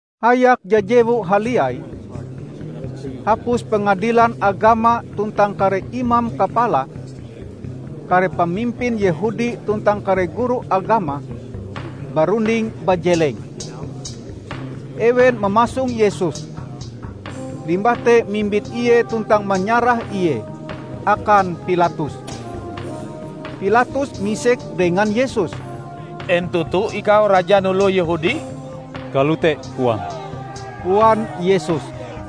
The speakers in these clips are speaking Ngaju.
Hayak jajewu haliai, hapus Pengadilan Agama tuntang kare imam kapala, kare pamimpin Yehudi tuntang kare guru agama barunding bajeleng. Ewen mamasong Yesus, limbah te mimbit Ie tuntang manyarah Ie akan Pilatus. Pilatus misek dengan Yesus, "En toto ikau Rajan Oloh Yehudi?" "Kalote koam," koan Yesus.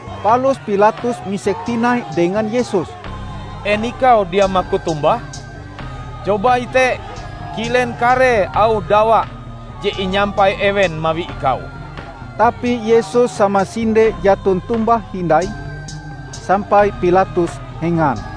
Palus Pilatus misek tinai dengan Yesus, "En Ikau dia maku tombah? Coba ite kilen karee auh dawa je inyampai ewen mawi Ikau!" Tapi Yesus samasinde jaton tombah hindai, sampai Pilatus hengan.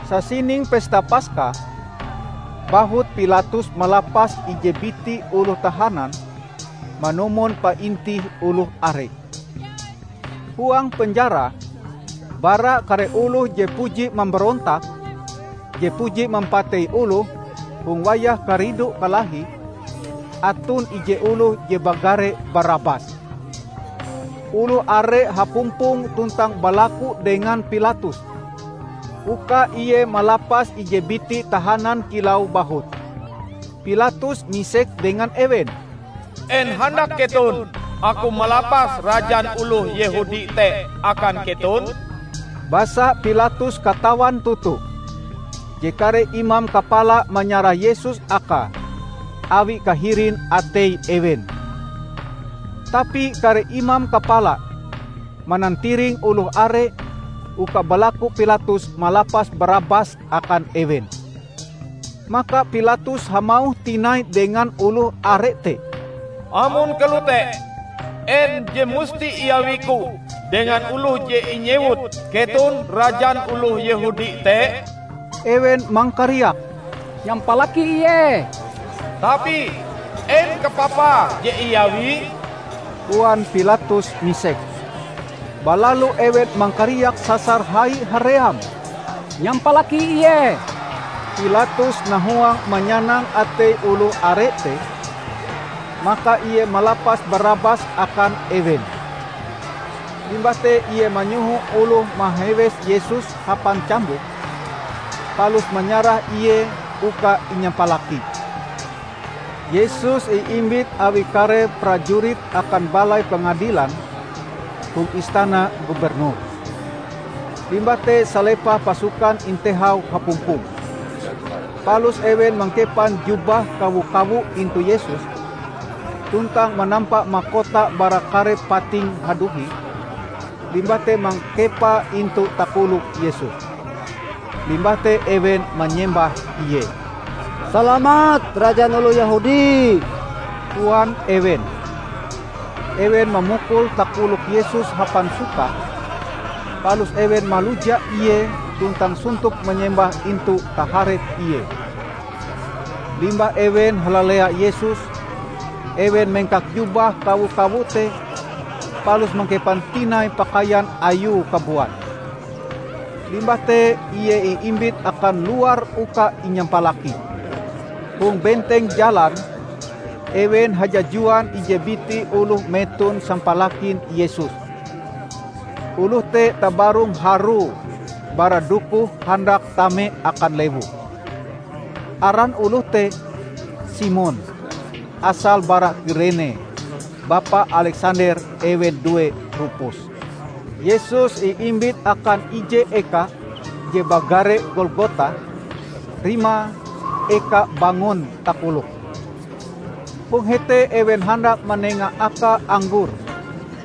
Sasining Pesta Paska, bahut Pilatus malapas ije biti oloh tahanan manumon paintih oloh are. Huang penjara, bara kare oloh je mambarontak je puji mampatei oloh hong wayah karidu-kalahi, aton ije oloh je bagare Barabas. Oloh are hapumpong tuntang balaku dengan Pilatus uka ie malapas ije biti tahanan kilau bahut. Pilatus misek dengan ewen, "En handak keton aku malapas rajan oloh Yehudi te akan keton?" Basa Pilatus katawan toto je kare imam kapala manyarah Yesus akae awi kahirin atei ewen. Tapi kare imam kapala manantiring oloh are uka balaku Pilatus malapas Barabas akan ewen. Maka Pilatus hamauh tinai dengan oloh are te, "Amon kalote, en je musti iawiku dengan oloh je inyewut keton Rajan Oloh Yehudi te?" Ewen mangkariak, "Nyampalaki Ie!" "Tapi en kapapa je iawie?" koan Pilatus misek. Balalu ewen mangkariak sasar hai haream, "Nyampalaki Ie!" Pilatus nahuang manyanang atei oloh are te, maka ie malapas Barabas akan ewen. Limbah te ie manyoho oloh mahewes Yesus hapan cambuk, palus manyarah Ie uka inyampalaki. Yesus iimbit awi kare prajurit akan balai pengadilan hong istana gubernur. Limbah te salepah pasukan intehau hapumpong. Palus ewen mangkepan jubah kawo-kawo intu Yesus, tuntang manampa makota bara kare pating haduhi, limbah te mangkepae intu takolok Yesus. Limbah te ewen manyembah Ie. "Salamat Rajan oloh Yehudi!" koan ewen. Ewen mamukul takolok Yesus hapan sukah, palus ewen maluja Ie tuntang sontop manyembah intu taharep Ie. Limbah ewen halalea Yesus, ewen mengkak jubah kawo-kawo te palus mangkepan tinai pakaian Ayue kabuat. Limbah te Ie iimbit akan luar uka inyampalaki. Hong benteng jalan ewen hajajuan ije biti oloh meton sampalakin Yesus. Oloh te tabarong harue bara dokohe handak tame akan lewu. (Aran oloh te Simon, asale bara Kirene -- bapa Aleksander ewen due Rupus.) Yesus iimbit akan ije eka je bagare Golgota, rimae "Eka Bangon Takolok". Hong hete ewen handak manenga Akae anggor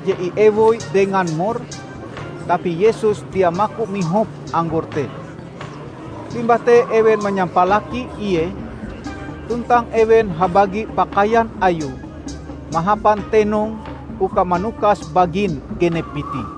je iewoi dengan mur, tapi Yesus dia maku mihop anggor te. Limbah te ewen manyampalaki Ie, tuntang ewen habagi pakaian Ayue mahapan tenong uka manukas bagin genep biti.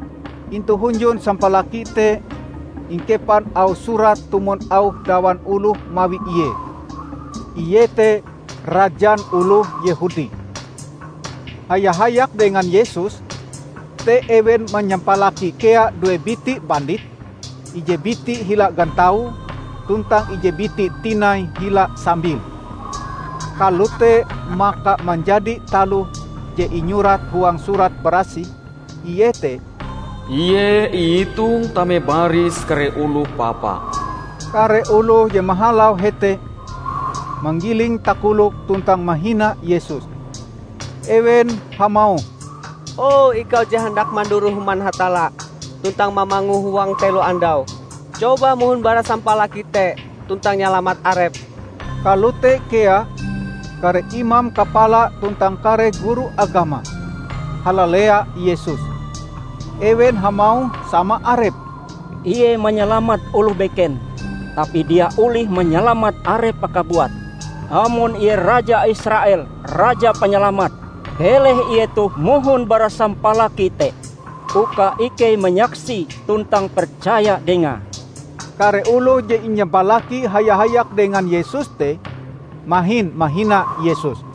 Intu hunjun sampalaki te ingkepan auh surat tumon auh dawan oloh mawi Ie, iete: "Rajan Oloh Yehudi". Haya-hayak dengan Yesus te ewen manyampalaki kea due biti bandit; ije biti hila gantaue tuntang ije biti tinai hila sambile. [ Kalote maka manjadi taloh je inyurat huang Surat Barasih, iete: "Ie iitong tame baris kare oloh papa."] Kare oloh je mahalau hete manggiling takoloke tuntang mahina Yesus. Ewen hamauh, "O, ikau je handak manduroh Human Hatalla tuntang mamangue huang telo andau. Coba mohon bara sampalaki te tuntang nyalamat Arepm!" Kalote kea kare imam kapala tuntang kare guru agama halalea Yesus. Ewen hamauh sama arepe, "Ie manyalamat oloh beken, tapi dia olih manyalamat Arepe kabuat! Amon Ie raja Israel, Raja Panyalamat, keleh Ie toh mohon bara sampalaki te, uka ikei manyaksie tuntang percaya Dengae!" Kare oloh je inyampalaki haya-hayak dengan Yesus te mahin mahina Yesus.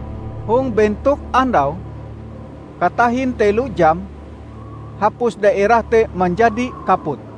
Hong bentok andau, katahin telo jam, hapus daerah te manjadi kaput.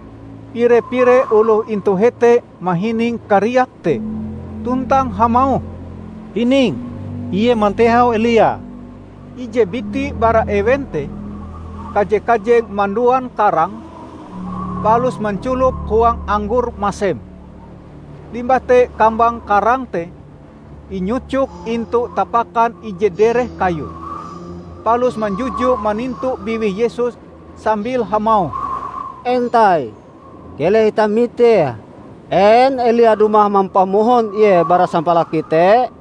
Pire-pire oloh intu hete mahining kariak te, tuntang hamauh, "Hining Ie mantehau Elia!" Ije biti bara ewen te kaje-kajeng manduan karang, palus manculop huang anggor masem. Limbah te kambang karang te inyucoke intu tapakan ije dereh kayu, palus manjujue manintu biwih Yesus sambil hamauh, "Entai, keleh itah mitee en Elia dumah mampamohon Ie bara sampalaki te."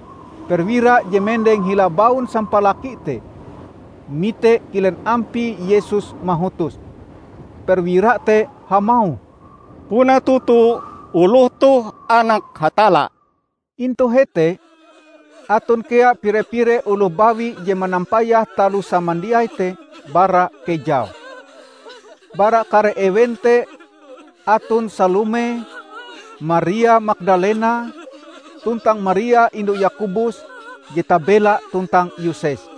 Perwira je mendeng hila baun sampalaki te, mite kilen ampie Yesus mahutos. Perwira te hamauh, "Puna toto oloh toh Anak Hatalla!" Intu hete aton kea pire-pire oloh bawi je manampayah taloh samandiai te bara kejau. Bara kare ewen te aton Salome, Maria Magdalena, tuntang Maria indu Yakobus je tabela tuntang Yoses.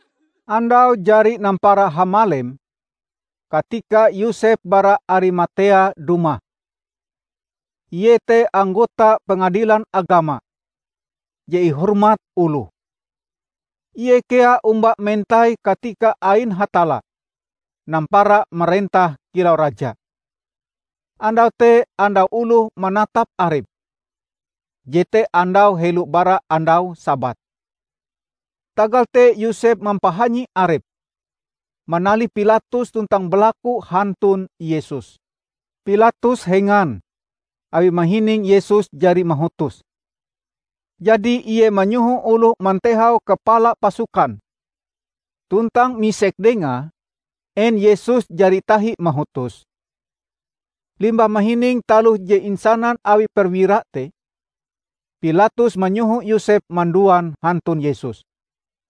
Andau jari nampara hamalem katika Yosep bara Arimatea dumah. Ie te anggota Pengadilan Agama je ihormat oloh. Ie kea omba mentai katika ain Hatalla nampara marentah kilau Raja. Andau te andau oloh manatap arepe (jete andau helo bara andau Sabat). Tagal te Yosep mampahanyi arepe manalih Pilatus tuntang balaku hantun Yesus. Pilatus hengan awi mahining Yesus jari mahutos. Jadi ie manyoho oloh mantehau kapala pasukan tuntang misek dengae en Yesus jari tahi mahutos. Limbah mahining taloh je insanan awi perwira te, Pilatus manyoho Yosep manduan hantun Yesus.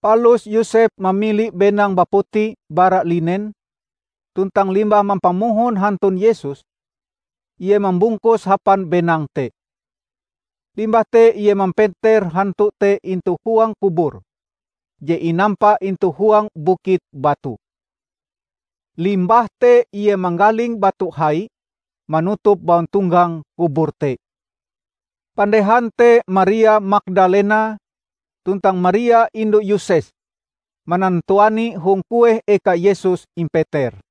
Palus Yosep mamili benang baputi bara linen tuntang limbah mampamohon hantun Yesus, ie mambungkuse hapan benang te. Limbah te ie mampeter hantu te intu huang kubur je inampa intu huang bukit batu. Limbah te ie manggaling batu hai manutup bauntonggang kubur te. Pandehan te Maria Magdalena tuntang Maria indu Yoses manantuani hong kueh eka Yesus impeter.